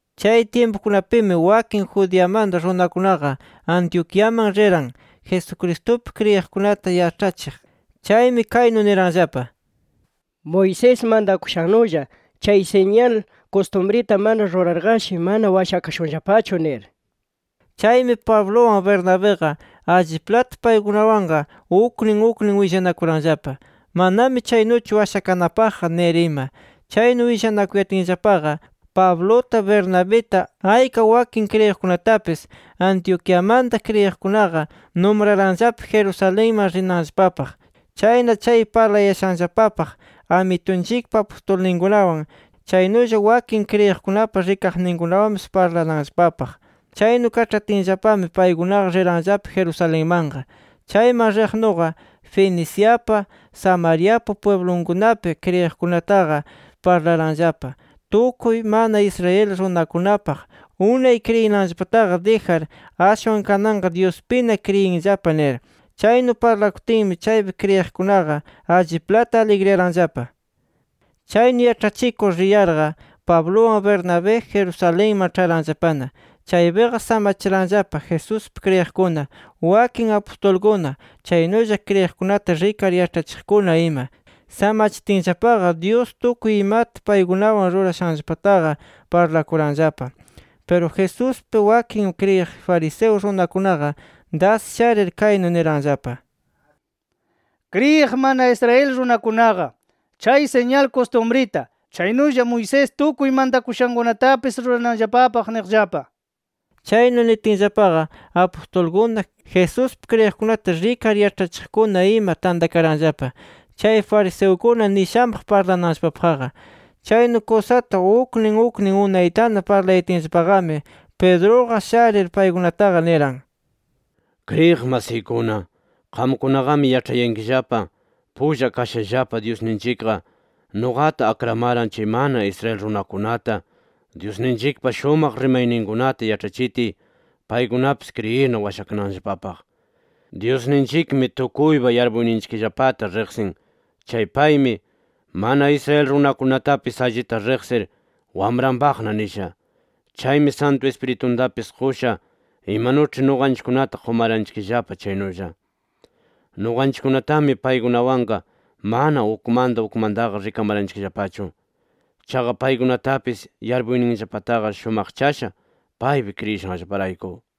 Chay tyimpukunapimi wakin Judeamanta runakunaqa Antioquiaman riran, Jesucristupi kriyiqkunata yaĉhachiq. Chaymi kaynu niranllapa: “Moisés mantakushannulla chay siñal kustumrita mana rurarqashi, mana washakashunllapachu” nir. Chaymi, Pabluwan Bernabiqa alliplata paykunawanqa, uknin uknin willanakuranllapa: “Manami chaynuchu washakanapaqqa” nir ima. Chaynu willanakuyatinllapaqa, Pabluta, Bernabita, ayka wakin kriyiqkunatapis, Antioquiamanta kriyiqkunaqa numraranllapa Jerusalenman rinanllapapaq. Chayna chay parlayashanllapapaq, Amitunchikpa apustulninkunawan, chaynulla wakin kriyiqkunapa rikaqninkunawanpis parlananllapapaq. Chaynu kaĉhatinllapami, paykunaqa riranllapa Jerusalenmanqa. Chayman riqnuqa, Feniciapa, Samariapa pwiblunkunapi kriyiqkunataqa parlaranllapa tukuy mana Israel runakunapaq: “Unay kriyinanllapataqa dijar ashwan kananqa, Dyuspina kriyinllapa” nir. Chaynu parlakutinmi, chaypi kriyiqkunaqa alliplata aligriyaranllapa. Chaynu yaĉhachikur riyarqa Pabluwan Bernabé Jerusalenman ĉharanllapana. Chaypiqa samachiranllapa Jesuspi kriyiqkuna, wakin apustulkuna, chaynulla kriyiqkunata rikar yaĉhachiqkuna ima. Samachitinllapaqa, Dyus tukuy imata paykunawan rurashanllapataqa parlakuranllapa. Piru Jesuspi wakin kriyiq fariseo runakunaqa das sharir, kaynu niranllapa: “Kriyiq mana Israel runakunaqa, chay siñal kustumrita, chaynulla Moisés tukuy mantakushakunatapis rurananllapapaq” niqllapa. Chaynu nitinllapaqa, apustulkuna, Jesuspi kriyiqkunata rikar yaĉhachiqkuna ima tantakaranllapa chay fariseukuna nishanpaq parlananllapapaqqa. Chaynu kusata uknin uknin unaytana parlayatinllapaqami, Pedruqa sharir paykunataqa niran: “Kriyiq masiykuna, qamkunaqami yaĉhayankillapa, pulla kashallapa Dyusninchikqa nuqata akramaran chay mana Israel runakunata, Dyusninchikpa shumaq rimayninkunata yaĉhachitiy, paykunapis kriyirna washakananllapapaq. Dyusninchikmi tukuypa yarpuyninchikllapata riqsin chay paymi, mana Israel runakunatapis allita riqsir wamranpaqna nisha. Chaymi Santu Ispirituntapis qusha, imanuĉhi nuqanchikkunata qumaranchikllapa chaynulla. Nuqanchikkunatami paykunawanqa mana ukmanta ukmantaqa rikamaranchikllapachu. Chaqa paykunatapis yarpuyninllapataqa shumaqchasha, paypi kriyishanllaparayku.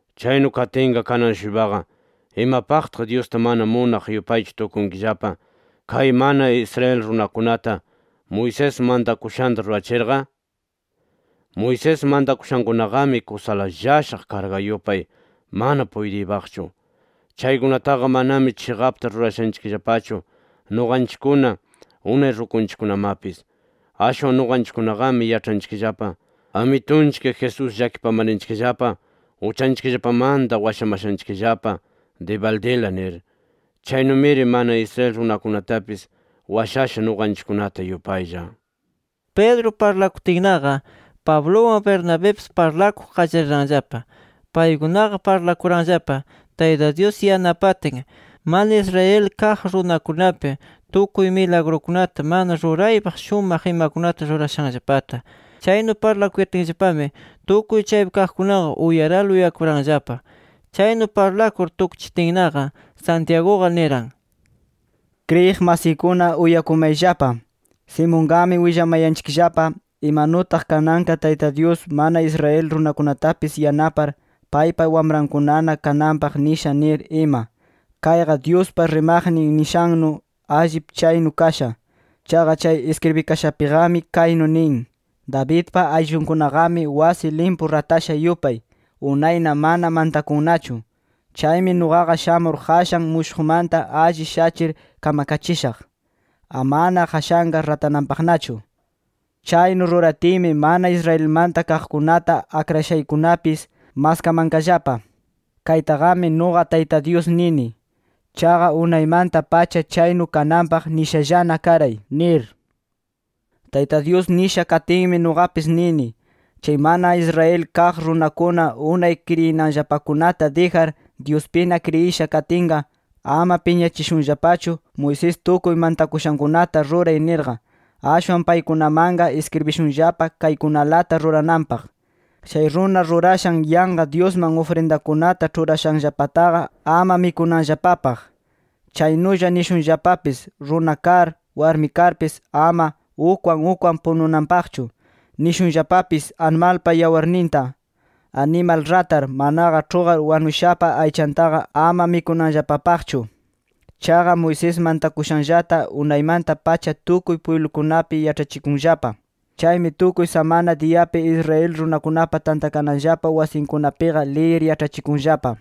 Chaynu katinqa kanan-shuypaqa ¿imapaqtaq Dyusta mana munaq yupaychu tukunkillapa, kay mana Israel runakunata, Moisés mantakushanta rurachirqa? Moisés mantakushankunaqami kusala llashaq karga yupay, mana puytiypaqchu. Chaykunataqa manami chiqapta rurashanchikllapachu nuqanchikkuna, unay rukunchikkunamapis. Ashwan nuqanchikkunaqami yaĉhanchikllapa Amitunchik Jesús llakipamarninchikllapa uchanchikllapamanta washamashanchikllapa dibaldila, nir. Chaynumiri mana Israel runakunatapis washasha nuqanchikkunata yupaylla”. Pedro parlakutinnaqa, Pabluwan Bernabipis parlakuq qallariranllapa. Paykunaqa parlakuranllapa Tayta Dyus yanapatin, mana Israel kaq runakunapi tukuy milagrukunata mana ruraypaq shumaq imakunata rurashanllapata. Chaynu parlakuyatinllapami tukuy chaypi kaqkunaqa uyarala uyakuranllapa. Chaynu parlakur tukchitinnaqa, Santiaguqa niran: “Kriyiq masiykuna uyakumayllapa. Simonqami willamayanchikllapa, imanutaq kananqa Tayta Dyus, mana Israel runakunatapis yanapar, paypa wamrankunana kananpaq nisha nir ima. Kayqa Dyuspa rimaqnin nishannu, allip chaynu kasha. Chaqa chay iskribikashapiqami kaynu nin: ‘Davidpa ayllunkunaqami wasi limpu ratasha yupay unayna mana mantakunnachu. Chaymi nuqa shamur qashan mushuqmanta alli shachir kamkachishaq, amana qashanqa ratananpaqnachu. Chaynu ruratiymi mana Israelmanta kaqkunata akrashaykunapis maskamanqallapa. Kaytaqami nuqa Tayta Dyus nini. Chaqa unaymanta-pacha chaynu kananpaq nishallana karay’ nir. “Tayta Dyus nisha katinmi nuqapis nini: Chay mana Israel kaq runakuna unay kriyinanllapakunata dijar, Dyuspina kriyisha katinqa, ama piñachishunllapachu ‘Moisés tukuy mantakushankunata ruray’ nirqa. Ashwan paykunamanqa iskribishunllapa kaykunalata rurananpaq: Chay runa rurashan yanqa dyusman ufrindakunata ĉhurashanllapataqa ama mikunanllapapaq. Chaynulla nishunllapapis runa kar, warmi karmapis ama ukwan ukwan pununanpaqchu. Nishunllapapis, animalpa yawarninta, animal ratar manaqa ĉhuqar wanushapa aychantaqa ama mikunanllapapaqchu. Chaqa Moisés mantakushanllata unaymanta-pacha tukuy pwiblukunapi yaĉhachikunllapa. Chaymi tukuy samana diyapi Israel runakunapa tantakananllapa wasinkunapiqa liyir yaĉhachikunllapa”.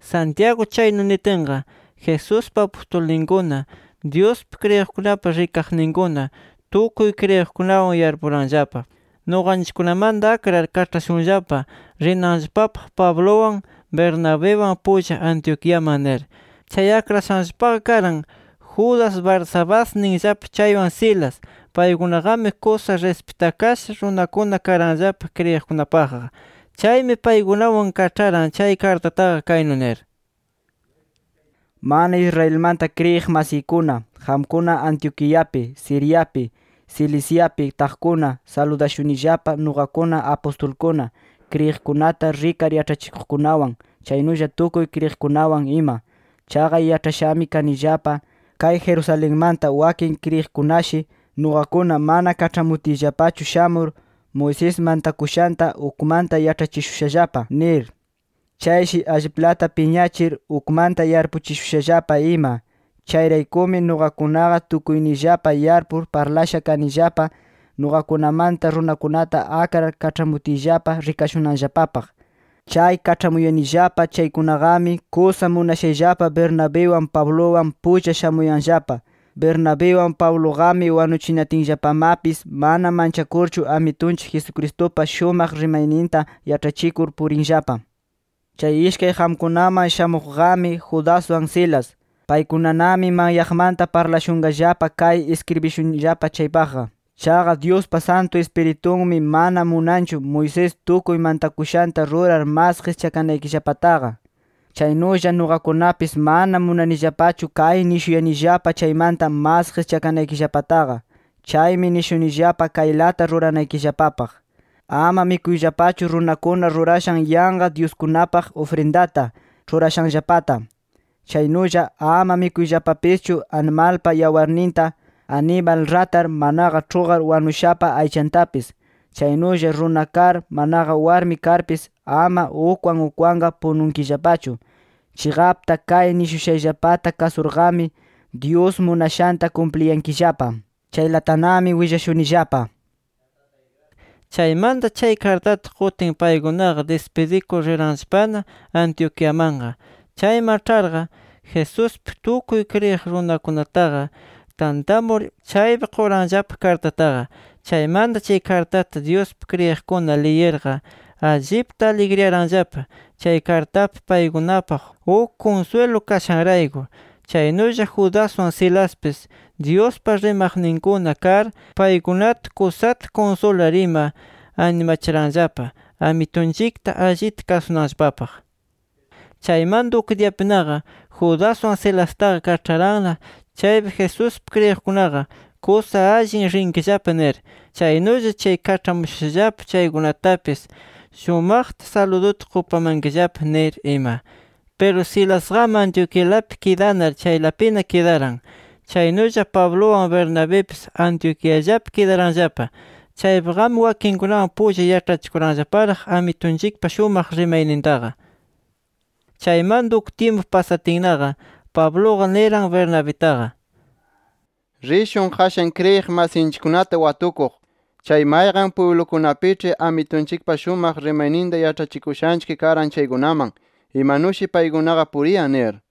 Santiago chaynu nitinqa, Jesuspa apustulninkuna, Dyuspi kriyiqkunapa rikaqninkuna, tukuy kriyiqkunawan yarpuranllapa: Nuqanchikkunamanta akrar kaĉhashunllapa rinanllapapaq Pabluwan Bernabiwan pulla Antioquiaman nir. Chay akrashanllapaqa karan Judas Barsabás ninllapa chaywan Silas. Paykunaqami kusa rispitakasha runakuna karanllapa kriyiqkunapaqqa. Chaymi, paykunawan kaĉharan chay kartataqa, kaynu nir: Mana Israelmanta kriyiq masiykuna, qamkuna Antioquiapi, Siriapi, Ciliciapi taqkunata saludashunillapa nuqakuna apustulkuna, kriyiqkunata rikar yaĉhachiqkunawan, chaynulla tukuy kriyiqkunawan ima. Chaqa yaĉhashami kanillapa, kay Jerusalenmanta wakin kriyiqkunashi, nuqakuna mana kaĉhamutiyllapachu shamur, Moisés mantakushanta ukmanta yaĉhachishushallapa, nir. Chayshi alliplata piñachir ukmanta yarpuchishushallapa ima. Chayraykumi nuqakunaqa tukuyniyllapa yarpur parlasha kanillapa, nuqakunamanta runakunata akrar kaĉhamutiyllapa rikashunanllapapaq. Chay kaĉhamuyanillapa chaykunaqami kusa munashayllapa Bernabiwan Pabluwan pulla shamuyanllapa. Bernabiwan Pabluqami wanuchinatinllapamapis mana manchakurchu Amitunchik Jesucristupa shumaq rimayninta yaĉhachikur purinllapa. Chay ishkay qamkunaman shamuqqami Judaswan Silas. Paykunanami manyaqmanta parlashunqallapa kay iskribishunillapa chaypaqqa. Chaqa Dyuspa Santu Ispiritunmi mana munanchu, Moisés tukuy mantakushanta rurar mas qischakanaykillapataqa. Chaynulla nuqakunapis mana munanillapachu kay nishuyanillapa chaymanta mas qischakanaykillapataqa. Chaymi nishunillapa kaylata ruranaykillapapaq: Ama mikuyllapachu runakuna rurashan yanqa dyuskunapaq ufrindata ĉhurashanllapata. Chaynulla ama mikuyllapapischu animalpa yawarninta, animal ratar manaqa ĉhuqar wanushapa aychantapis. Chaynulla runa kar manaqa warmi karpis ama ukwan ukwanqa pununkillapachu. Chiqapta kay nishushayllapata kasurqami, Dyus munashanta kumpliyankillapa. Chaylatanami willashunillapa. Chaymanta chay kartata qutin, paykunaqa dispidikur riranllapana Antioquiamanqa. Chayman ĉharqa Jesuspi tukuy kriyiq runakunataqa tantamur, chaypi quranllapa kartataqa. Chaymanta chay kartata Dyuspi kriyiqkuna liyirqa allipta aligriyaranllapa, chay kartapi paykunapaq uk kunswilu kashanrayku. Chaynulla Judaswan Silaspis Dyuspa rimaqninkuna kar, paykunata kusata kunsular ima, animachiranllapa, Amitunchikta allita kasunanllapapaq. Chaymanta uk diyapinaqa, Judaswan Silastaqa kaĉharanna chaypi, Jesuspi kriyiqkunaqa “Kusa allin rinkillapa” nir. “Chaynulla chay kaĉhamushushallapa chaykunatapis shumaqta saluduta qupamankillapa” nir ima. [ Piru Silasqami Antioquialapi kidanar, chaylapina kidaran.] Chaynulla Pabluwan Bernabipis Antioquiallapi kidaranllapa. Chaypiqami wakinkunawan pulla yaĉhachikuranllaparaq Amitunchikpa shumaq rimaynintaqa. Chaymanta uk tyimpu pasatinnaqa, Pabluqa niran Bernabitaqa: —Rishun qashan kriyiq masinchikkunata watukuq, chay mayqan pwiblukunapiĉhi Amitunchikpa shumaq rimayninta yaĉhachikushanchik karan chaykunaman, imanushi paykunaqa puriyan nir.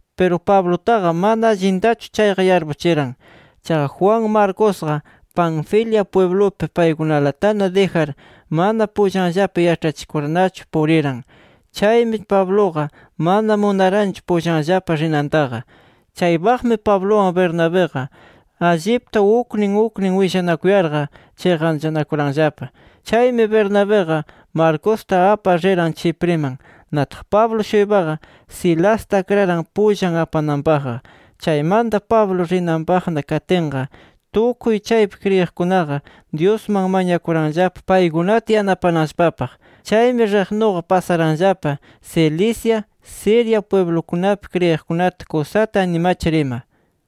Piru Pablutaqa mana allintachu chayqa yarpuchiran. Chaqa Juan Marcosqa Panfilia pwiblupi paykunalatana dijar mana pullanllapa yaĉhachikurnachu puriran. Chaymi Pabluqa mana munaranchu pullanllapa rinantaqa. Chaypaqmi Pabluwan Bernabiqa allipta uknin uknin willanakuyarqa, chiqanchanakuranllapa. Chaymi Bernabiqa Marcosta apar riran Chipriman. Nataq Pablo-shuypaqa Silasta akraran pullan apananpaqqa. Chaymanta Pablo rinanpaqna katinqa, tukuy chaypi kriyiqkunaqa Dyusman mañakuranllapa paykunata yanapananllapapaq. Chaymi riqnuqa pasaranllapa Cilicia, Siria pwiblukunapi kriyiqkunata kusata animachir ima.